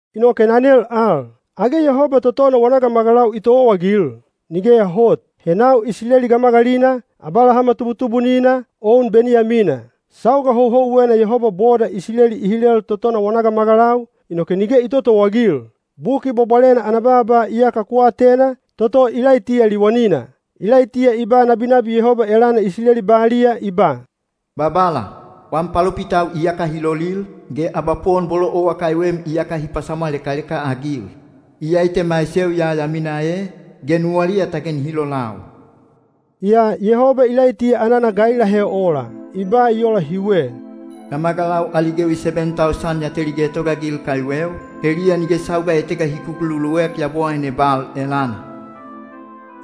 Inoke na nel al, “Age Yehoba totona wana gamagalau i towaagil?” Nigeya hot. He nau Isileli gamagalina, Abalahama tubutubunina, o un Beniyamina. Sauga houhouwena Yehoba boda Isileli i hilel totona wana gamagalau, inoke nige i totowaagil. Buki Bwabwalena ana baaba iyaka ku atena, toto Ilaitiya liwanina. Ilaitiya i ba nabinabi Yehoba elana Isileli baliya, i ba, “Babala, wam palopitau iyaka hi gopaaligal, ge abapowon bolo owa kaiwem iyaka hi pasamwalekaleka-agil. Iyai te maiseu ya ya mina e, ge nuwaliya te nihi lopaaligau.” Yaa Yehoba Ilaitiya anana ga i lahe ola? I ba i ola hiwe: “Gamagalau ali gewi seben tausan ya teli getogaagil kaiweu, heliya nige sauga etega hi kukululuek yabowaine Bal elana.”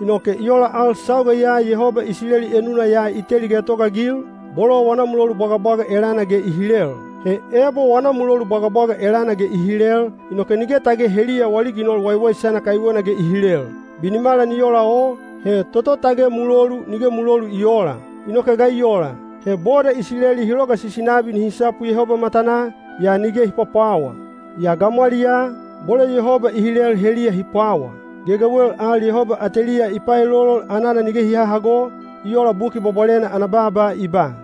Inoke i ola al sauga ya Yehoba Isileli enuna ya i teli getogaagil, bolo wana mulolu bwagabwaga elana ge i hilel. He ebo wana mulolu bwagabwaga elana ge i hilel, inoke nige tage heliya wali ginol waiwaisana kaiwena ge i hilel. Binimala ni ola o, he toto tage mulolu nige mulolu i oola. Inoke ga i ola? He boda Isileli hi logasisi nabi nihi sapu Yehoba matanaa, yaa nige hi pwapwawa. Yaa gamwaliyaa, bolo Yehoba i hilel heliya hi pwawa. Gegewel al Yehoba ateliya i paelolol anana nige hi hahago, i ola Buki Bwabwalena ana baaba i ba,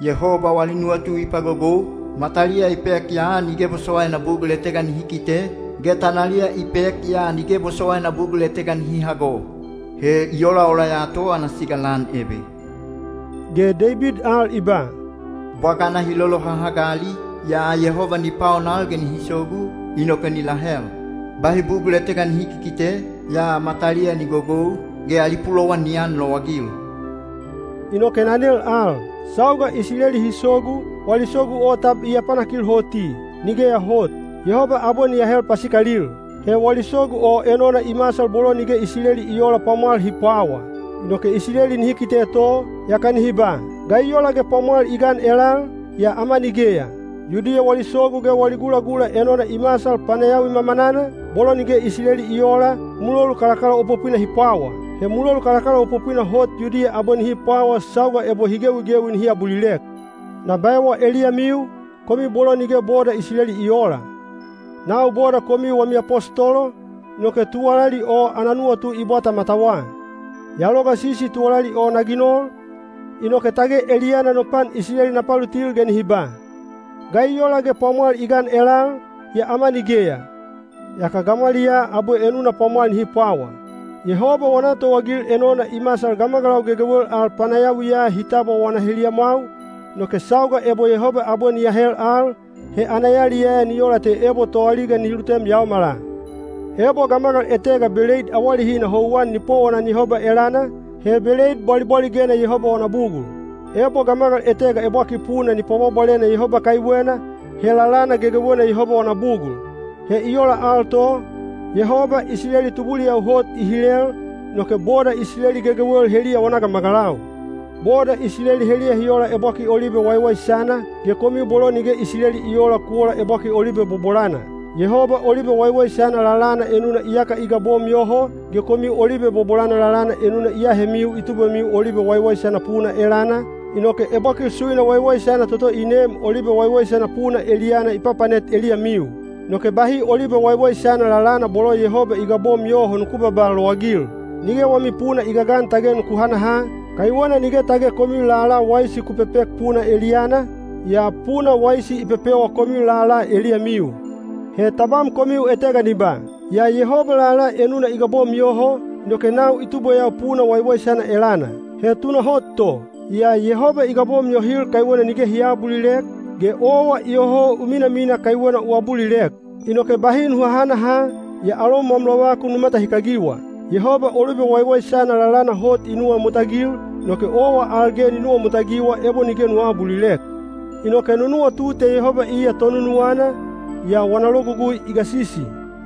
“Yehoba wali nuwatu i pagogou, mataliya i pek yaa nige bosowaina bugul etega nihi kite, ge tanaliya i pek yaa nige bosowaina bugul etega nihi hago. He i olaola ya to ana siga lan ebe.” Ge Deibid al i ba, “Bwagana hi lolohahagali, yaa Yehoba ni paonal ge nihi sogu, inoke ni lahel. Bahi bugul etega nihi kikite, yaa mataliya ni gogou, ge ali pulowan ni anlowagil.” Inoke na nel al, “Sauga Isileli hi sogu, wali sogu o tab i apanakil hoti?” Nigeya hot! Yehoba abwe ni ahel pasikalil. He wali sogu o enona i masal bolo nige Isileli i oola pwamwal hi pwawa. Inoke Isileli nihi kite to, yaka nihi ba, “Ga i ola ge pwamwal i gan elal, yaa ama nigeya?” Yudiya wali sogu ge wali gulagula enona i masal panayawi mamanana, bolo nige Isileli i oola, mulolu kalakalaopopwina hi pwawa. He mulolu kalakalaopopwina hot Yudiya abwe nihi pwawa sauga ebo hi gewigewi nihi abulilek. Na baewa eliyamiu, komiu bolo nige boda Isileli i oola. Nau boda komiu wami apostolo, inoke tuwalali o ana nuwatu i bwata matawa. Ya logasisi tuwalali o na ginol, inoke tage eliyana no pan Isileli na palutil ge nihi ba, “Ga i ola ge pwamwal i gan elal, yaa ama nigeya?” yaka gamwaliyaa abwe enuna pwamwal nihi pwawa. Yehoba wana towaagil enona i masal gamagalau gegewel al panayawiya hi tabwa wana heliyamwau, inoke sauga ebo Yehoba abwe ni ahel al, he ana yaliyaya ni ola te ebo toaliga nihi lutem yaomala! Ebo gamagal etega beleid awalehina houwan ni powonan Yehoba elana, he beleid bwalibwaligena Yehoba wana bugul. Ebo gamagal etega ebwakil puna ni pwabwabwalena Yehoba kaiwena, he lalana gegewena Yehoba wana bugul. He i ola al to, Yehoba Isileli tubuliyau hot i hilel, inoke boda Isileli gegewel heliya wana gamagalau. Boda Isileli heliya hi ola ebwakil olibe waiwaisana, ge komiu bolo nige Isileli i oola ku ola ebwakil olibe bobolana. Yehoba olibe waiwaisana lalana enuna iyaka i gabom yoho, ge komiu olibe bobolana lalana enuna i ahemiu i tubwemiu olibe waiwaisana puna elana, inoke ebwakil suina waiwaisana toto i neem olibe waiwaisana puna eliyana i papanet eliyamiu. Inoke bahi olibe waiwaisana lalana bolo Yehoba i gabom yoho nuku babaa lowagil. Nige wami puna i gagan tage nuku hanaha, kaiwena nige tage komiu lala waisi ku pepek puna eliyana, yaa puna waisi i pepewa komiu lala eliyamiu. He tabam komiu etega ni ba, “Yaa Yehoba lala enuna i gabom yoho, inoke nau i tubweyau puna waiwaisana elana.” He tunahot to, yaa Yehoba i gabom yohil kaiwena nige hi aabulilek, ge owa iyoho u minamina kaiwena u abulilek. Inoke bahi nu hahanaha, yaa alom wam lovakun nu matahikagiwa. Yehoba olibe waiwaisana lalana hot i nuwamutagil, inoke owa al ge ni nuwamutagiwa ebo nige nu aabulilek. Inoke nu nuwatu te Yehoba iya tonunuwana, yaa wana logugui i gasisi.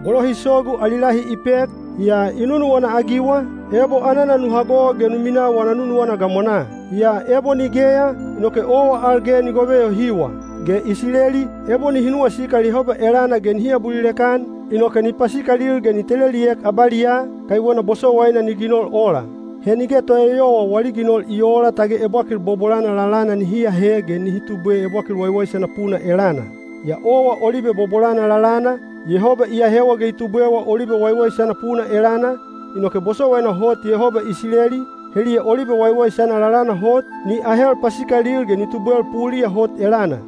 Bolo hi sogu ali lahi i pek, yaa i nunuwana-agiwa, ebo anana nu hago ge nu minaa wana nunuwana gamwanaa. Yaa ebo nigeya, inoke owa al ge ni gove yohiwa. Ge Isileli, ebo nihi nuwasikal Yehoba elana ge nihi abulilek-an, inoke ni pasikalil ge ni teleliek abaliyaa, kaiwena bosowaina ni ginol ola. He nige toeyowa wali ginol i oola tage ebwakil bobolana lalana nihi ahe ge nihi tubwe ebwakil waiwaisana puna elana. Yaa owa olibe bobolana lalana, Yehoba i ahewa ge i tubwewa olibe waiwaisana puna elana, inoke bosowaina hot Yehoba Isileli, heliya olibe waiwaisana lalana hot, ni ahel pasikalil ge ni tubwel puliya hot elana.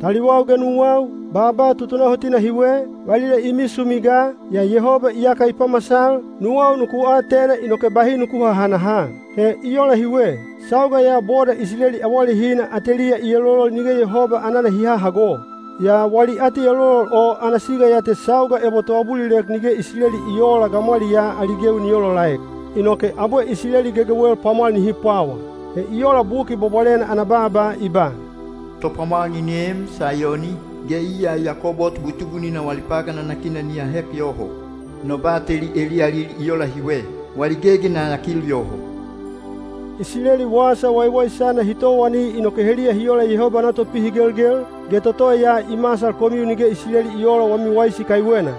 Taliwau ge nuwau, baaba tutunahotina hiwe, valila i misumi ga, yaa Yehoba iyaka i pamasal, nuwau nuku atena inoke bahi nuku hahanaha. He i ola hiwe: sauga ya boda Isileli awalehina ateliya i elolol nige Yehoba anana hi hahago. Yaa wali atielolol o ana siga ya te sauga ebo toabulilek nige Isileli i oola gamwaliyaa ali gewi ni olaolaek. Inoke abwe Isileli gegewel pwamwal nihi pwawa. He i ola Buki Bwabwalena ana baaba i ba, “Topwamwal ni neem Saiyoni, ge iya Yakobo tubutubunina wali pagan nanakina ni ahek yoho. No bateli eliyalil i ola hiwe: wali gegi na yakil yoho.” Isileli Wasa Waiwaisana hi towani inoke heliya hi ola Yehoba ana topihigelgel, ge toto ya i masal komiu nige Isileli i oola wami waisi kaiwena.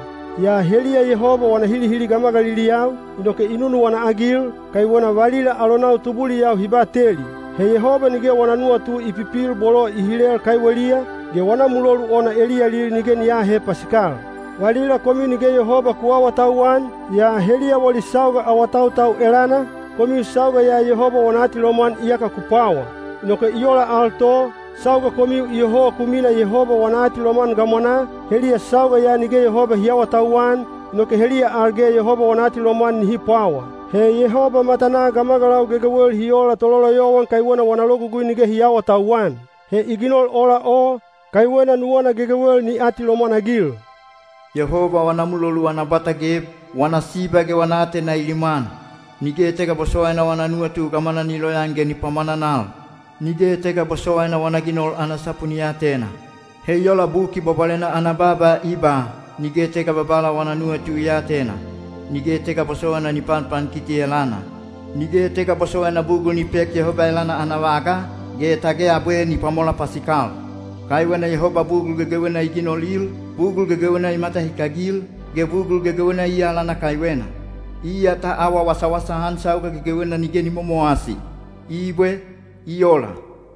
Yaa heliya Yehoba wana hilihili gamagaliliyau, inoke i nunuwana-agil, kaiwena valila alonau tubuliyau hi bateli. He Yehoba nige wana nuwatu i pipil bolo i hilel kaiweliya, ge wana mulolu ona eliyalil nige ni aahe pasikal. Valila komiu nige Yehoba ku aawatauwan, yaa heliya wali sauga awatautau elana, komiu sauga ya Yehoba wana atilomwan iyaka ku pwawa. Inoke i ola al to, sauga komiu iyoho ku mina Yehoba wana atilomwan gamwanaa, heliya sauga ya nige Yehoba hi aawatauwan, inoke heliya al ge Yehoba wana atilomwan nihi pwawa. He Yehoba matanaa gamagalau gegewel hi ola tololoyowan kaiwena wana logugui nige hi aawatauwan. He i ginol ola o, kaiwena nuwana gegewel ni atilomwan-agil. Yehoba wana mulolu ana bwata geb! Wana siba ge wana aatena i limwan! Nige etega bosowaina wana nuwatu gamwana ni loyaan ge ni pwamwananal! Nige etega bosowaina wana ginol ana sapu ni atena! He i ola Buki Bwabwalena ana baaba i ba: Nige etega Babala wana nuwatu i aatena. Nige etega bosowaina ni panpankiti elana. Nige etega bosowaina bugul ni pek Yehoba elana ana vaga, ge tage abwe ni pwamola pasikal. Kaiwena Yehoba bugul gegewena i ginolil, bugul gegewena i matahikagil, ge bugul gegewena iya alana kaiwena. Iya ta awa wasawasa-an sauga gegewena nige ni momowasi. Ibwe. I ola.